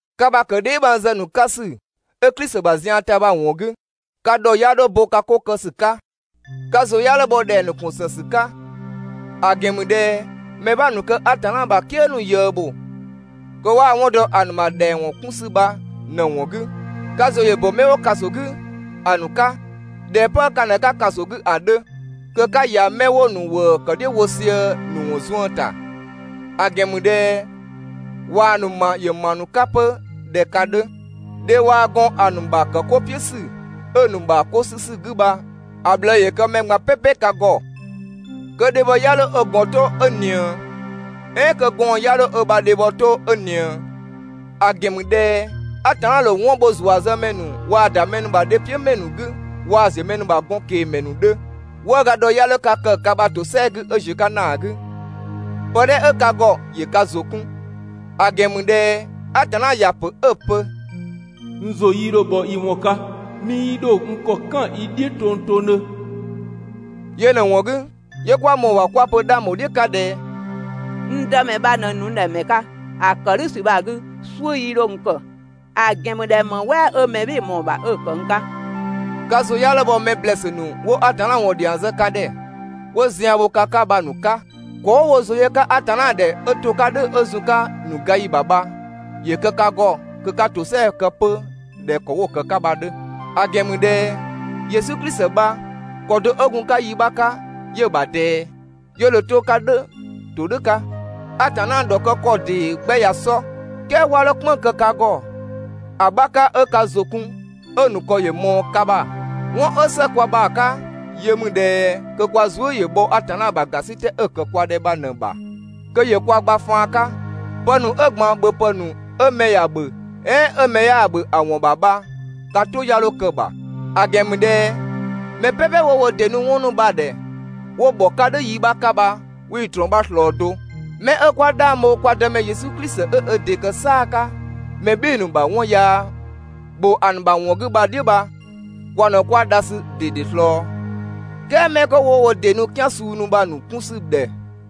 Ka ‑bha ‑kë dheebhangzë ‑nu 'ka ‑sü 'ö Klisi ‑bha zian ‑ta bha‑ ‑wɔn 'gü, ka ‑dhɔ 'ya 'dho bo ka 'ko kë ‑sü 'ka. Ka ‑zʋ 'ya 'dho bhɔ ‑dhɛng ‑nu ‑kun ‑së ‑sü 'ka, ‑a ‑gɛn ‑mü ꞊dhɛ mɛ 'bha ‑nu kë Atanna ‑bha "kië ‑nu ꞊yëë ‑bho kö 'waa‑ 'wɔn dɔ ‑a ‑nu ‑bha ‑dhɛng ‑wɔn 'kun ‑sü bha ꞊në‑ ‑wɔn 'gü. Ka ‑zʋ ‑yö ‑bö 'mɛ 'wo ‑kaso 'gü ‑a ‑nu 'ka, ꞊dhɛ 'pë ka ꞊në 'ka ‑kaso 'gü ‑a 'dhö. Kö 'ka ‑ya 'mɛ 'wo‑ ‑nu ‑wëë ‑kë "dhiʋ̈ wo sië‑ ‑nu ‑wɔn zuën ‑ta, ‑a ‑gɛn ‑mü ꞊dhɛ ꞊waa‑ ‑nu ‑ma ‑yö ‑ma ‑nu 'ka 'pö ꞊dhɛ ka 'dhö. Dhe waa‑ gɔn ‑a ‑nu ‑bha ‑kë 'ko "piʋ̈ ‑sü 'ö‑ ‑nu ‑bha 'ko 'sü ‑sü 'gü bha‑ ꞊bhlëë ‑yö kë mɛ ꞊gban "pɛpɛ ka ‑gɔ, kö dhebhɔ 'ya 'dho ö ‑gɔn 'to 'ö ꞊nië, "ɛɛn kö gɔɔn‑ 'ya 'dho ö ‑bha dhebhɔ 'to 'ö ꞊nië. ‑A ‑gɛn ‑mü ꞊dhɛ Atanna ‑dho 'wɔn bho ‑zuazëmɛ ‑nu waa‑ ‑da mɛ ‑nu ‑bha dhe "piʋ̈ ‑mɛ ‑nu 'gü waa ‑ziö mɛ ‑nu ‑bha gɔn ꞊kengmɛ ‑nu 'dhö. 'Wëëga ‑dhɔ 'ya 'dho ka kë ka ‑bha ‑tosɛa 'gü 'ö ‑ziö 'ka ‑naa 'gü, pë 'dhɛ 'ö ka ‑gɔ ‑yö ka ‑zʋ 'kun, ‑a ‑gɛn ‑mü ꞊dhɛ Atanna ‑ya ‑pö 'ö‑ pö: «N ‑zʋ 'yii 'dho bhɔ i ‑wɔn 'ka, 'mii 'dho n ‑kɔ "kan i "dhiʋ̈ tongtongdhö.» Yö ꞊në‑ ‑wɔn 'gü, 'yö 'kwa ꞊mɔɔ‑ ‑bha 'kwa‑ pö 'dhang ‑bho "dhiʋ̈ 'ka ꞊dhɛ: «N Dëmɛ bha ꞊në ‑nu n ‑dhɛ ‑mɛ 'ka, ‑a ‑kë "dhʋ̈ ‑sü bha‑ 'gü, "suʋ̈ 'yii 'dho n kë, ‑a ‑gɛn ‑mü ꞊dhɛ ‑më "wɛɛ 'ö mɛ "bhɩɩ‑ ꞊mɔɔ‑ ‑bha 'ö‑ ‑kë n 'ka?» Ka ‑zʋ 'ya 'dho bhɔ 'mɛ ‑blɛɛsü ‑nu 'wo Atanna ‑wɔn ‑dhiang zë ka ‑dhɛ, 'wo zian bho ka 'ka bha‑ ‑nu 'ka. ‑Kɔ 'wo wo ‑zʋ yö‑ 'ka Atanna ‑dhɛ 'ö to‑ 'ka "dhʋ̈ 'ö zun‑ 'ka‑ ‑nu gayi ‑bha bha, ‑yö kë ka ‑gɔ kö 'ka ‑tosɛa kë 'pö ꞊dhɛ ‑kɔ 'wo‑ ‑kë 'ka bha‑ 'dhö. ‑A ‑gɛn ‑mü ꞊dhɛ Yesu Klisi bha, ‑kɔ do 'ö gun‑ ‑bha yi 'bha 'ka 'yö‑ ‑bha ꞊dɛɛ, 'yö dho 'to‑ 'ka "dhʋ̈ ‑todhʋ̈ 'ka. Atanna ‑dhɔkë ‑kɔ ‑dee 'gbɛ ꞊ya sɔ, "kɛɛ 'wa 'dho "kpënng‑ kë ka ‑gɔ ‑a 'bha 'ka 'ö ka ‑zʋ kun 'ö‑ ‑nu ‑kɔ ‑yö ꞊mɔɔ ka ‑bha. 'Wɔn 'ö ‑së kwa ‑bha 'ka yö ‑mü ꞊dhɛ kö kwa zuë" ‑yö bhɔ Atanna ‑bha ‑gasitɛ 'ö‑ ‑kë kwa ‑dhɛ bha ꞊në‑ ‑bha kö ‑yö kwa gba faan 'ka, pë ‑nu 'ö ‑gban ‑bhöpë ‑nu 'ö mɛ ‑ya ‑bhö "ɛɛn 'ö mɛ 'yaa‑ ‑bhö ‑a ‑wɔn ‑bha bha ka "tʋ 'ya 'dho kë‑ ‑bha. ‑A ‑gɛn ‑mü ꞊dhɛ mɛ "pɛpɛ 'wo wo ‑dɩ nu 'wɔn ‑nu bha‑ ‑dhɛ 'wo ‑bhɔ 'ka yi 'bha 'ka bha, 'wii‑ ꞊trɔɔn 'bha ꞊slɔɔ do. 'Mɛ 'ö 'kwa 'dhang bho kwa Dëmɛ Yesu Klisi 'ö ö ‑dɩ ‑kë "saa‑ 'ka mɛ "bhɩɩ‑ ‑nu ‑bha 'wɔn yaa ‑bho ‑a ‑nu ‑bha ‑wɔn 'gü bha‑ "dhiʋ̈ bha kwa ꞊në 'kwa dha ‑sü ꞊dede ꞊slɔɔ, "kɛɛ 'mɛ 'kö 'wo wo ‑dɩ nu "kian suu ‑nu bha‑ ‑nu 'kun ‑sü ‑dhɛ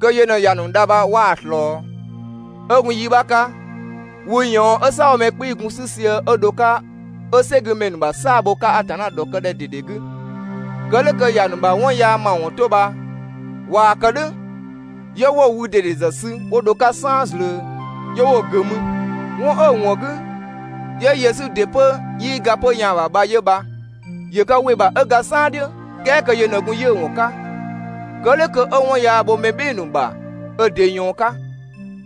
kö yö ꞊në ‑ya ‑nu dha bha 'waa‑ ꞊slɔɔ. 'Ö gun yi 'bha 'ka, wü ꞊yɔɔn 'ö "saabhomɛ 'kpii‑ gun‑ 'sü sië 'ö dho‑ 'ka 'ö "sɛgümɛ ‑nu ‑bha "saa‑ bho‑ 'ka Atanna ‑dhɔkëdhɛ ꞊dede 'gü, kë "dhʋ̈ kö ‑ya ‑nu ‑bha 'wɔn yaa ‑mawɔn 'to bha ꞊waa‑ kë "dhʋ̈, 'yö 'wo‑ wü ꞊dede ‑zë sü 'wo dho‑ 'ka "saan zlöö, 'yö 'wo‑ ‑gʋ̈ mü. 'Wɔn 'ö‑ ‑wɔn 'gü, 'yö Yesu ‑dɩ pö 'yii ga 'pö‑ yaan‑ ‑bha bha 'yö bha. ‑Yö ka ‑wɩ ‑bha 'ö ga "saan "dhiʋ̈ "kɛɛ kö yö ꞊në gun 'yiʋ̈‑ ‑wɔn 'ka. Kë "dhʋ̈ kö 'ö 'wɔn yaa bho mɛ "bhɩɩ‑ ‑nu ‑bha ö ‑dɩ ꞊yɔɔn 'ka.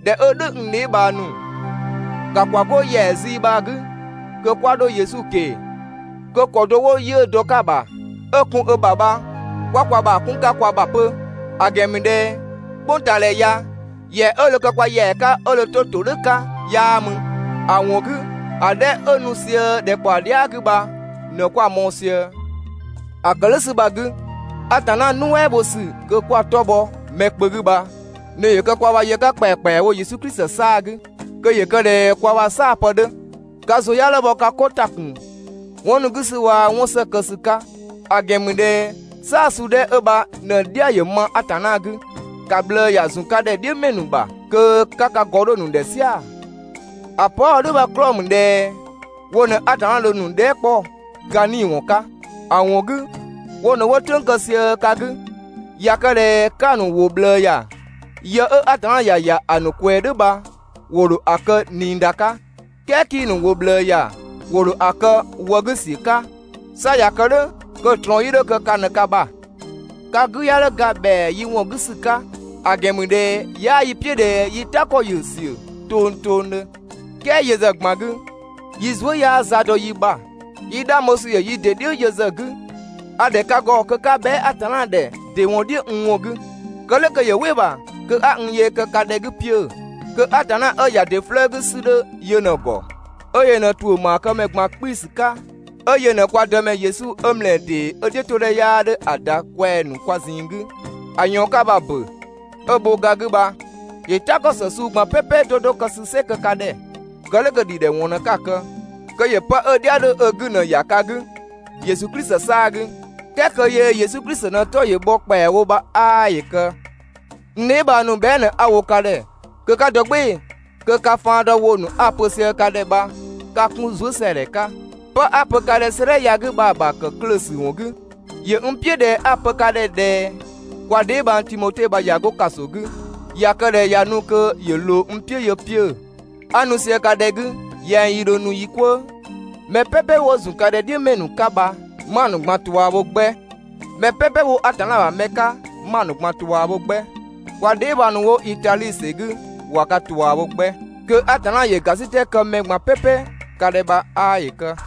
꞊Dhɛ 'ö "dhʋ̈, n dheebhang ‑nu, ‑ka ‑kwa 'go ‑yɛa zii bha‑ 'gü kö 'kwa 'dho Yesu ꞊keng‑, kö ‑kɔ do 'wo 'yiʋ̈‑ dɔ‑ 'ka‑ ‑bha 'ö‑ kun ö ‑bha bha 'kwa kwa ‑bha 'kun 'ka kwa ‑bha 'pö. ‑A ‑gɛn ‑mü ꞊dhɛ "kpʋngtaadhɛ ya ‑yɛa 'ö dho kë kwa ‑yɛa 'ka 'ö dho 'to ‑todhʋ̈ 'ka 'yaa mü. ‑A ‑wɔn 'gü, ‑a 'dhɛ 'ö nu sië ‑dhɛkpaɔ dhia" 'gü bha ꞊në 'kwa‑ mɔɔ‑ sië. ‑A ‑kë "dhʋ̈ ‑sü bha‑ 'gü, Atanna nuɛ" bho ‑sü kö 'kwa‑ 'tɔ bhɔ mɛ kpö 'gü bha ꞊në ‑yö kë kwa ‑bha yë 'ka ‑kpɛakpɛawo Yesu Klisi 'saa‑ 'gü, kö ‑yö kë ꞊dhɛ kwa ‑bha "saa‑ pë 'dhö. Ka ‑zʋ 'ya 'dho bhɔ ka 'ko ‑ta ‑kun 'wɔn ‑nu 'gü ‑sü waa‑ 'wɔn ‑së kë ‑sü 'ka. ‑A ‑gɛn ‑mü ꞊dhɛ "saa‑ suu 'dhɛ 'ö bha ꞊në‑ "dhia ‑yö ma Atanna 'gü. ‑Ka ꞊bhlëë ‑ya ‑zun ka ‑dhɛ "dhiʋ̈ ‑mɛ ‑nu ‑bha kö 'ka ka ‑gɔ 'dho‑ ‑nu ‑dhɛ "sia‑. ‑A pö 'a‑ wo "dhʋ̈ bha‑ 'klɔɔ‑ ‑mü ꞊dhɛ wo ꞊në Atanna dho‑ ‑nu dhɛɛ" 'kpɔ ka 'nii‑ ‑wɔn 'ka. ‑A ‑wɔn 'gü, wo ꞊në 'wo "tʋ̈ng kë sië ka 'gü. ꞊Ya kë ꞊dhɛ 'ka‑ ‑nu ‑wʋ ꞊bhlëë ‑ya, yë 'ö Atanna ‑ya ‑ya ‑a ‑nu ꞊kwɛɛ "dhʋ̈ bha ‑wo ‑dho ‑a kë ꞊niida 'ka, "kɛɛ 'kii‑ ‑nu ‑wʋ ꞊bhlëë ‑ya ‑wo ‑dho ‑a kë wë 'gü ‑siö 'ka, 'sa ꞊ya kë "dhʋ̈ kö‑ ꞊trɔɔn 'yii 'dho kë ka ꞊në ka ‑bha. Ka 'gü 'ya 'dho ga ‑bhɛa yi ‑wɔn 'gü ‑sü 'ka, ‑a ‑gɛn ‑mü ꞊dhɛ 'yaa 'yi "piʋ̈ ꞊dhɛ yi "ta ‑kɔ ‑yö ‑siö tongtongdhö. "Kɛɛ yö ‑zë ꞊gban 'gü, yi zuë" 'yaa za dɔ yi ‑bha, yi 'dhang bho ‑sü ‑yö yi ‑dɩ "dhiʋ̈ yö ‑zë 'gü. A‑ ‑dhɛ ka ‑gɔ kö 'ka bhɛa" Atanna ‑dhɛ ‑dɩ ‑wɔn "dhiʋ̈ n ‑wɔn 'gü, kë "dhʋ̈ kö ‑yö "wɩ‑ ‑bha kö 'a n yee kë ka ‑dhɛ 'gü 'piö‑. Kö Atanna 'ö ‑ya ‑dɩ 'flëë‑ 'gü ‑sü 'dhö yö ꞊në‑ ‑gɔ, 'ö yö ꞊në ‑tuʋ̈ ‑maakëmɛ ꞊gban 'kpii‑ ‑sü 'ka, 'ö yö ꞊në kwa Dëmɛ Yesu 'ö ‑mlɛɛ ‑dee 'ö‑ "dhiʋ̈todhɛ 'yaa 'dhö ‑a ‑da kwɛng‑ ‑nu kwa ꞊zinng 'gü ‑a ꞊yɔɔn 'ka bha‑ ‑bö, 'ö‑ ‑bho ga 'gü bha, ‑yö "ta ‑kɔ ‑së suu ꞊gban "pɛpɛ 'do 'do kë ‑sü "sɩ kë ka ‑dhɛ, kë "dhʋ̈ kö‑ ‑dhidhɛwɔn ꞊në 'ka‑ kë, kö ‑yö 'pë 'ö‑ "dhia 'dhö ö 'gü ꞊në‑ ‑ya ka 'gü, Yesu Klisi 'saa‑ 'gü, "kɛɛ kö yö Yesu Klisi ꞊në‑ 'tɔ ‑yö bhɔ ‑kpɛawo bha 'aa ‑yö kë. N dheebhang ‑nu, bhɛa" ꞊në 'a‑ wo ka ‑dhɛ kö 'ka dɔ "gbɩɩ‑ kö ka faan dɔ ‑wʋ ‑nu 'a‑ pö sië ka ‑dhɛ bha 'ka‑ 'kun zuësɛadhɛ 'ka, 'pë 'a‑ pö ka ‑dhɛ 'sëëdhɛ ya‑ 'gü bha‑ ‑bha ‑kë klöö‑ ‑sü ‑wɔn 'gü. ‑Yö n "piʋ̈ ꞊dhɛ 'a‑ pö ka ‑dhɛ ꞊dhɛ kwa dheebhang Timote bha ꞊ya 'go ‑kaso 'gü, ꞊ya kë ꞊dhɛ ꞊ya nu kö ‑yö ꞊loo n "piʋ̈ yö 'piö‑, 'a nu sië ka ‑dhɛ 'gü yɛng yi ‑dho nu yi "kwëë. Mɛ "pɛpɛ wo ‑zun ka ‑dhɛ "dhiʋ̈ ‑mɛ ‑nu 'ka bha, 'ma‑ ꞊gban ꞊tua bho 'gbɛ, mɛ "pɛpɛ 'wo Atanna ‑bha mɛ 'ka 'ma‑ ꞊gban ꞊tua bho 'gbɛ. Kwa dheebhang ‑nu 'wo Itadhi ‑sɛ 'gü ꞊wa ka ꞊tua bho 'gbɛ. Kö Atanna ‑yö ‑gasitɛ kë mɛ ꞊gban "pɛpɛ ka ‑dhɛ bha 'aa ‑yö kë.